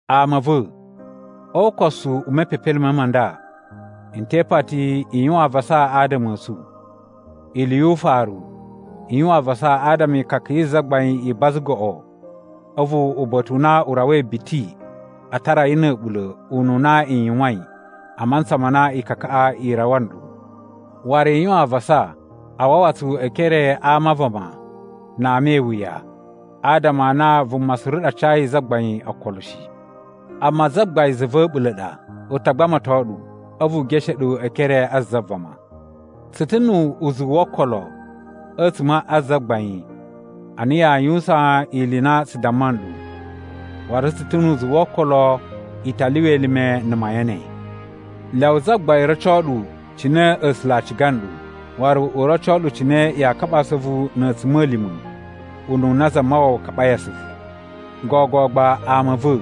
Ama a̱ va̱, o ukosu u mepepelime ma nda, n te ipati i yuwan avasa adama a̱ tsu. Ili yu ufaru, i yuwan avasa adama e ikaka yi Zagbain i baza goꞌo a̱vu uba̱ta̱ u na u rawai biti, a tara yi na̱ a̱ɓula̱ ununa i yuwain a mantsa ma na ikakaꞌa i rawa nɗu. Waru i yuwan avasa a wawa tsu e ekere a ama a vama na ama e iwuya, adama a na vuma suru ɗa cayi Zagbain okolo shi. Amma Zagbain za va̱ a̱ɓula̱ ɗa, u ta gbamato ɗu, a̱vu u geshe ɗu e ekere a za vama. Tsu ta̱ nu uzuwu wo okolo a̱tsuma̱ a Zagbain a na yaa yuwusan ili i na tsu damma nɗu, waru tsu ta̱ nu uzuwu wo okolo i ta lyuwa elime na̱ mayan ne. Lyawa Zagbain roco ɗu cine A̱sula̱ a ciga nɗu, waru u roco ɗu cine yaa kaɓa asuvu na̱ a̱tsuma̱lima̱ ununa Zamawawa kaɓai asuvu. Gogo gba ama a̱ va̱,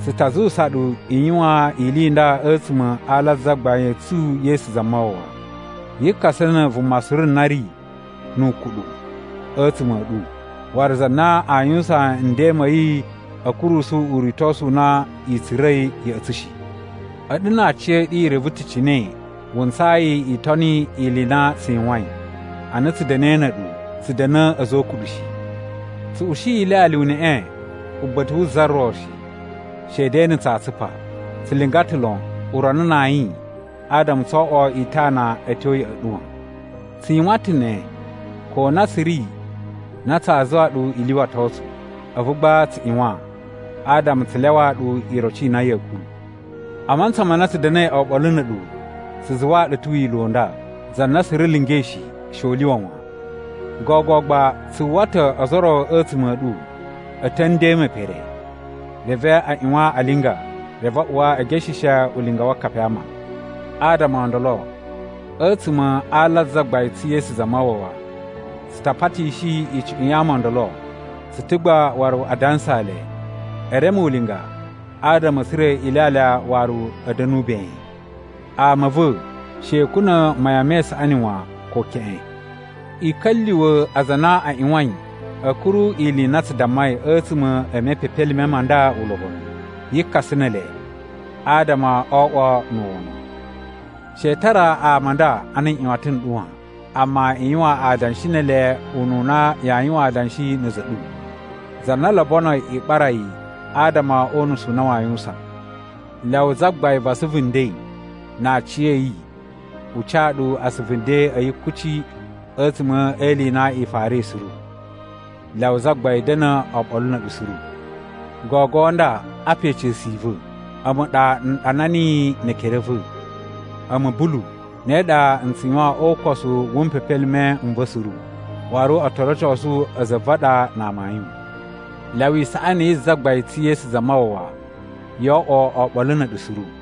tsu ta zuwusa ɗu i yuwan ili i nda a̱tsuma̱ a ala a Zagbain tsu Yesu Zamawawa: Yi kasa na̱ vuma suru na ri nu ukuɗu a̱tsuma̱ a̱ ɗu waru za na aa yuwusan nden ma̱ yi a̱ kurusu uritosu u na i tsura̱i ya̱ꞌa̱ tsu shi. A̱ɗu na aciya̱ɗu i reve ta̱ cine wuntsayi i toni ili i na tsu yuwain. Ana tsu da̱na̱i na̱ a̱ɗu, tsu da̱na̱ a̱za̱ o ukuɗu shi. Tsu ushi ilyalya uneꞌe uba̱ta̱ wu za ro shi, shede na̱ tsaa tsupa. Tsu linga ta̱ lon urana na ayin adama tsoo oꞌwo itana a̱ tyo ya̱ꞌa̱ ɗu wan. Tsu yuwan ta̱ ne ko na tsu ri na tsaa zuwa ɗu i lyuwato tsu, a̱vu gba tsu ꞌyuwan adama tsu lyawaa ɗu iroci i na ya̱a̱ kuru. A mantsa ma na tsu da̱na̱i oɓolo na̱ a̱ɗu, tsu zuwaa ɗu ta̱ wila̱ u nda: “Za na suru lingai shi, she u lyuwa wan.” Gogo gba tsu uwwa ta̱ ozo o ro a̱tsuma̱ a̱ ɗu a̱ ta̱ a̱ nden me pere, reve a ꞌyuwan a linga, reve a uwa e gesheshe ulinga wa akapi a ama. Adama o ndolo, a̱tsuma̱ a ala a Zagbain tsu Yesu Zamawawa, tsu ta patishi icuꞌun ya ama o ndolo, tsu ta̱ gba waru a dansaa le, e reme ulinga adama a̱ tsura̱ ilyalya waru a̱ da̱nu ben. Ama a̱ va̱, she i kuna̱ mayan me isaꞌani wan ko keꞌen. I ka̱lyuwa̱ aza a na a ꞌyuwain a̱ kuru ili i na tsu dammai a̱tsuma̱ e mepepelime ma nda ulobonu. Yi kasa ne ele, adama o oꞌwo na̱ wono. She i tara ama a nda ana nꞌyuwatan n ɗu wan, amma i yuwan adanshi ne ele ununa yaa yuwan adanshi na̱ a̱za̱ a̱ ɗu, za na lobonoi i ɓara yi adama o unusu u na waa yuwusan. Lyawa Zagbain va asuvu nden na aciya̱yi u ca ɗu asuvu nden a̱ yi kuci a̱tsuma̱ e ili i na i farai suru. Lyawa Zagbain da̱na̱ oɓolo na̱ a̱ɗu suru. Gogo nda apa ica̱su i va̱, a̱mu ɗa n ɗana niyi ne ekere a̱ va̱. A̱mu, Bulu, ne ɗa n tsu yuwan o ukosu wu mpepelime n va̱ suru, waru o to rocosu a̱za̱ a̱ va̱ a ɗa na amayun. Lyawa isaꞌani yi Zagbain tsu Yesu Zamawawa yo oꞌwo oɓolo na̱ a̱ɗu suru.